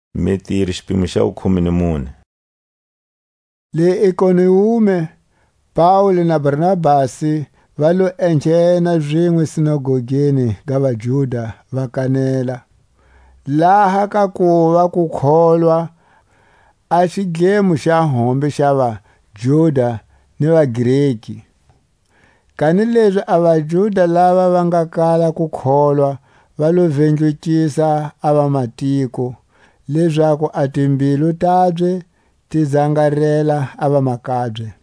Paule na Barnabasi va gonzisa le Ikoniume, ni Listra, ni Derbe. Le Ikoniume, Paule na Barnabasi va lo enghena zinwe sinagogeni ga vaJuda va kanela, laha ka kuva ku kholwa a xidlemo xa hombe xa vaJuda ni vaGreki. Kanilezi a vaJuda lava va nga kala ku kholwa va lo vindlukisa a vamatiko, lezaku a timbilu tabye ti zangarela a vamakabye.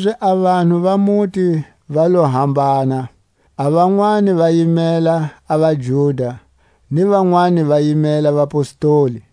Kanilezi a vanhu va muti va lo hambana, a vanwani va yimela a vaJuda ni vanwani va yimela vapostoli.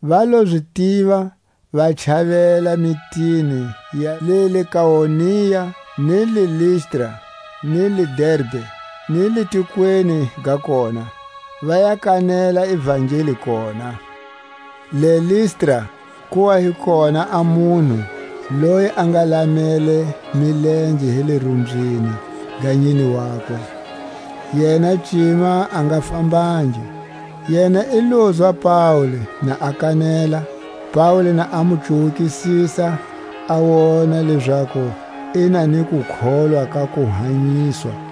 va lo zi tiva, va chavela mitini ya le Likaonia, ni le Listra, ni Derbe, ni le tikweni ga kona; va ya kanela ivangeli kona. Le Listra ku wa hi kona a munhu loyi a nga lamele milenge hi le rumbyini ga nyine wakwe, yena cima a nga fambangi. Yena i lozwa Paule na a kanela; Paule na a mu cuwukisisa, a wona lezaku i na ni kukholwa ka ku hanyiswa,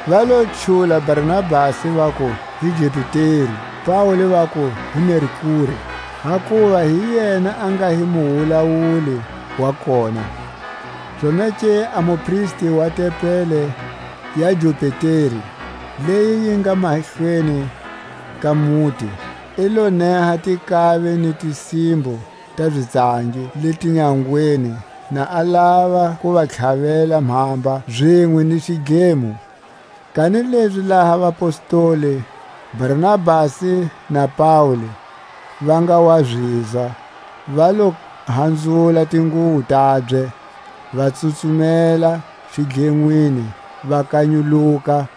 Va lo chula Barnabasi vaku hi Jupiteri; Paule vaku hi Merkure, hakuva hi yena a nga hi muwulawuli wa kona. Zonake a mupristi wa tempeli ya Jupiteri, leyi yi nga mahlweni ka muti, i lo neha tinkavi ni tisimbo ta zitsangi le tinyangweni, na a lava ku va tlhavela mhamba zinwe ni xidlemo. Kanilezi laha vapostoli, Barnabasi na Paule, va nga wa zizwa, va lo hanzula tinguwo tabye, va tsutsumela xidlenwini, va kanyuluka,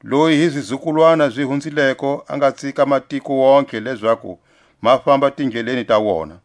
loyi hi zizukulwana zi hunzileko a nga tsika matiko wontihe lezaku ma famba tindleleni ta wona.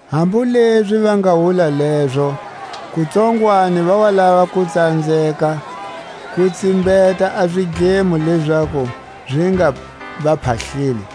Hambu lezi va nga wula lezo, kutsongwani va wa lava ku tsanzeka ku tsimbeta a zidlemo lezaku zi nga va phahleli.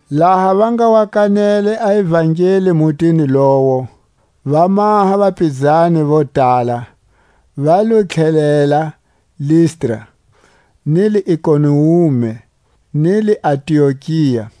Laha va nga wa kanele a ivangeli mutini lowo, va maha vapizani vo tala, va lo tlhelela Listra, ni le Ikoniume, ni le Antiokia,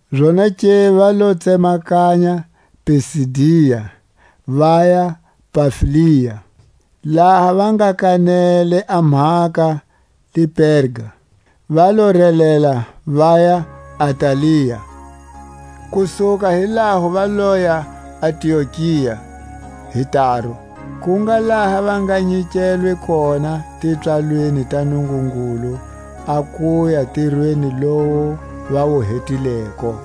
Zonake va lo tsemakanya Pisidia, vaya Pamfilia. Laha va nga kanele a mhaka le Perga, va lo relela vaya Atalia; ku suka hi laho va loya Antiokia hi taru, ku nga laha va nga nyikelwe kona tipswalweni ta Nungungulu a kuya ntirweni lowu va wu hetileko.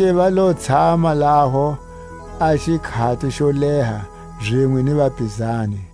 Zonake va lo tshama laho a xikhati xo leha zinwe ni vapizani.